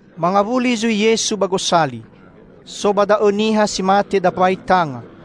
Mangawuli zui Yesu ba gosali. So ba da'õ niha si mate dambai tanga.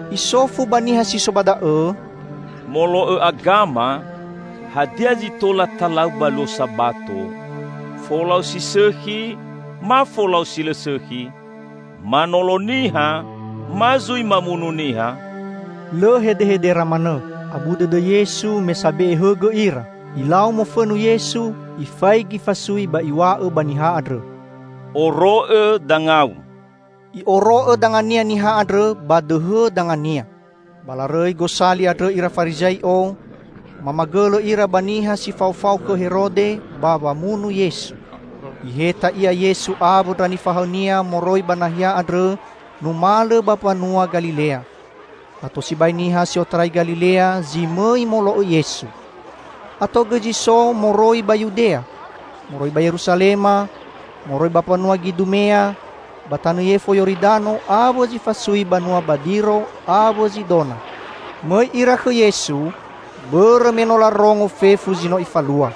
Isofu ba niha si so ba da'õ, "Molo'õ agama, hadia zi tola talau ba luo Sabato? Folau si sõkhi ma folau si lõ sõkhi? Manolo niha ma zui mamunu niha?" Lõ hedehedera manõ. Abu dõdõ Yesu, me sabe'e hõgõ ira. Ilau mofõnu Yesu, Ifaigi fasui ba Iw̃a'õ ba niha andrõ, "Oro'õ dangau." I'oro'õ dangania niha andrõ ba dõhõ dangania. Ba larõi gosali andrõ ira Farizai'o, mamagõlõ ira ba niha si faofao khõ Herode, ba wamunu Yesu. Iheta Ia Yesu awõ ndra nifahaõ-Nia moroi ba nahia andrõ numalõ ba mbanua Galilea. Ato sibai niha si otarai Galilea zi mõi molo'õ Yesu. Ato gõi zi so moroi ba Yudea, moroi ba Yerusalema, moroi ba mbanua Gidumea, ba tanõ yefo Yoridano awõ zi fasui banua ba Diro awõ Zidona. Mõi ira khõ Yesu, bõrõ me no larongo fefu zi no Ifalua.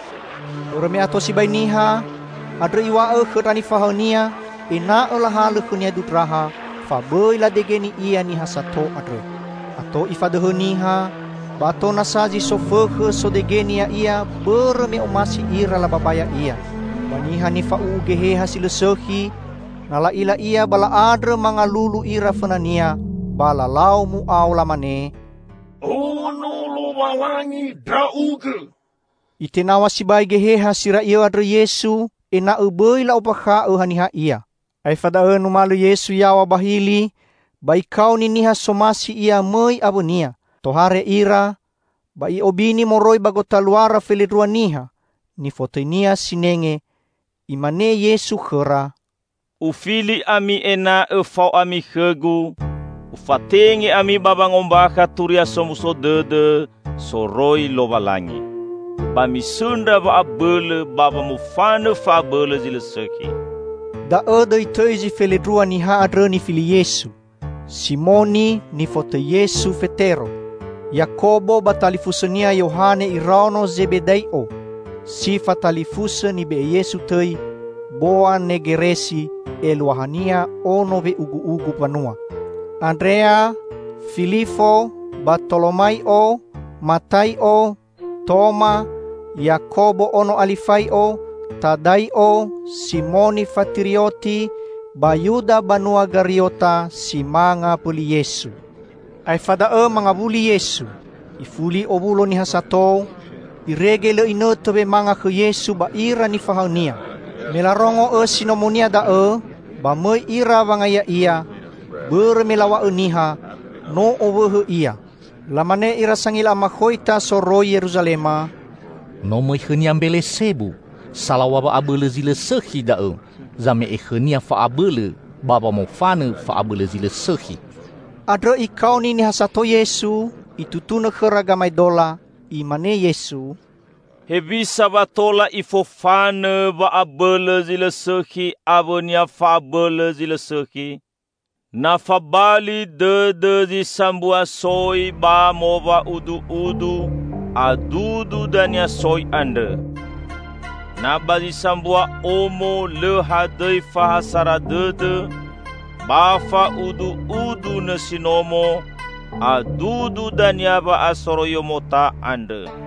Bõrõ me ato sibai niha, andrõ Iw̃a'õ khõ ndra nifahaõ-Nia ena'õ lahalõ khõ-Nia dundraha, fabõi ladegeni Ia niha sato andrõ. Ato Ifadõhõ niha, ba ato nasa zi so fõkhõ sodegeni Ya'ia bõrõ me omasi ira lababaya Ia. Ba niha nifa'u'u geheha si lõ sõkhi, na la'ila Ia ba la'andrõ mangalulu ira fõna-Nia ba lalau mu'ao lamane, "Ono Lowalangi Ndra'ugõ!" Itenaw̃a sibai geheha si ra'iõ andrõ Yesu ena'õ bõi la'ombakha'õ haniha Ia. Aefa da'õ numalõ Yesu yaw̃a ba hili, ba Ikaoni niha somasi Ia mõi awõ-Nia. Tohare ira, ba I'obini moroi ba gotaluara felendrua niha, nifotõi-Nia Sinenge. Imane Yesu khõra, "Ufili ami ena'õ fao ami khõ-Gu, Ufatenge ami ba wangombakha Turia Somuso Dõdõ soroi Lowalangi. Ba misõndra wa'abõlõ ba wamofanõ fa'abõlõ zi lõ sõkhi." Da'õ dõitõi zi felendrua niha andrõ nifili Yesu: Simoni (nifotõi Yesu, Fetero), Yakobo ba talifusõnia Yohane iraono Zebedai'o (si fatalifusõ nibe'e Yesu tõi Boanegeresi; eluahania "ono we'ugu'ugu mbanua"). Andrea, Filifo, Batolomai'o, Matai'o, Toma, Yakobo ono Alifai'o, Tadai'o, Simoni Fatirioti, ba Yuda banua Gariota si manga mbõli Yesu. Aefa da'õ mangawuli Yesu. Ifuli owulo niha sato, irege lõ inõtõ wemanga khõ Yesu ba ira nifahaõ-Nia. Me larongo õsi nomo-Nia da'õ, ba mõi ira wangai Ya'ia, bõrõ me law̃a'õ niha, "No owõhõ Ia!" Lamane ira sangila amakhoita soroi Yeruzalema, "No mõi khõ-Nia Mbelesebu! Salaw̃a wa'abõlõ zi lõ sõkhi da'õ zame'e khõ-Nia fa'abõlõ ba wamofanõ fa'abõlõ zi lõ sõkhi." Andrõ Ikaoni niha sato Yesu, Itutunõ khõra gamaedola. Imane Yesu, "Hewisa wa tola ifofanõ wa'abõlõ zi lõ sõkhi awõnia fa'abõlõ zi lõ sõkhi?" "Na fabali dõdõ zi sambua soi ba mowa'udu'udu, adudu dania soi andrõ. Na ba zi sambua omo lõ hadõi fahasara dõdõ, ba fa'udu'udu nõsi nomo, adudu dania wa'asoroiyomota andrõ.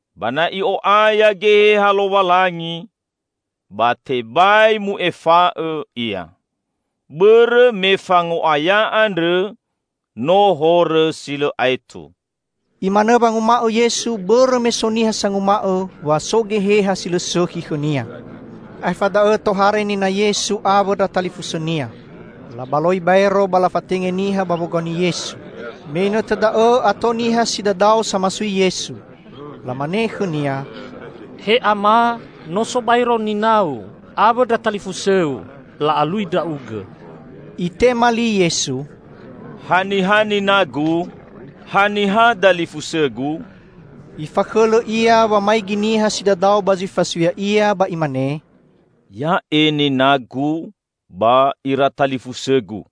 Ba na i'o'aya Geheha Lowalangi, ba tebai mu'efa'õ ia! Bõrõ me fango'aya andrõ no horõ si lõ aetu!" (Imanõ wanguma'õ Yesu bõrõ me so niha sanguma'õ wa so geheha si lõ sõkhi khõ-Nia.) Aefa da'õ tohare nina Yesu awõ ndra talifusõ-Nia. Labaloi baero ba lafatenge niha ba wogaoni Yesu. Me inõtõ da'õ ato niha si dadao samasui Yesu. Lamane khõ-Nia, "He Ama, no so baero nina-U awõ ndra talifusõ-U, la'alui Ndra'ugõ!" Itema li Yesu, "Haniha nina-Gu? Haniha dalifusõ-Gu?" Ifakhõlõ Ia wamaigi niha si dadao ba zi fasui Ya'ia ba Imane, "Ya'e nina-Gu ba ira talifusõ-Gu!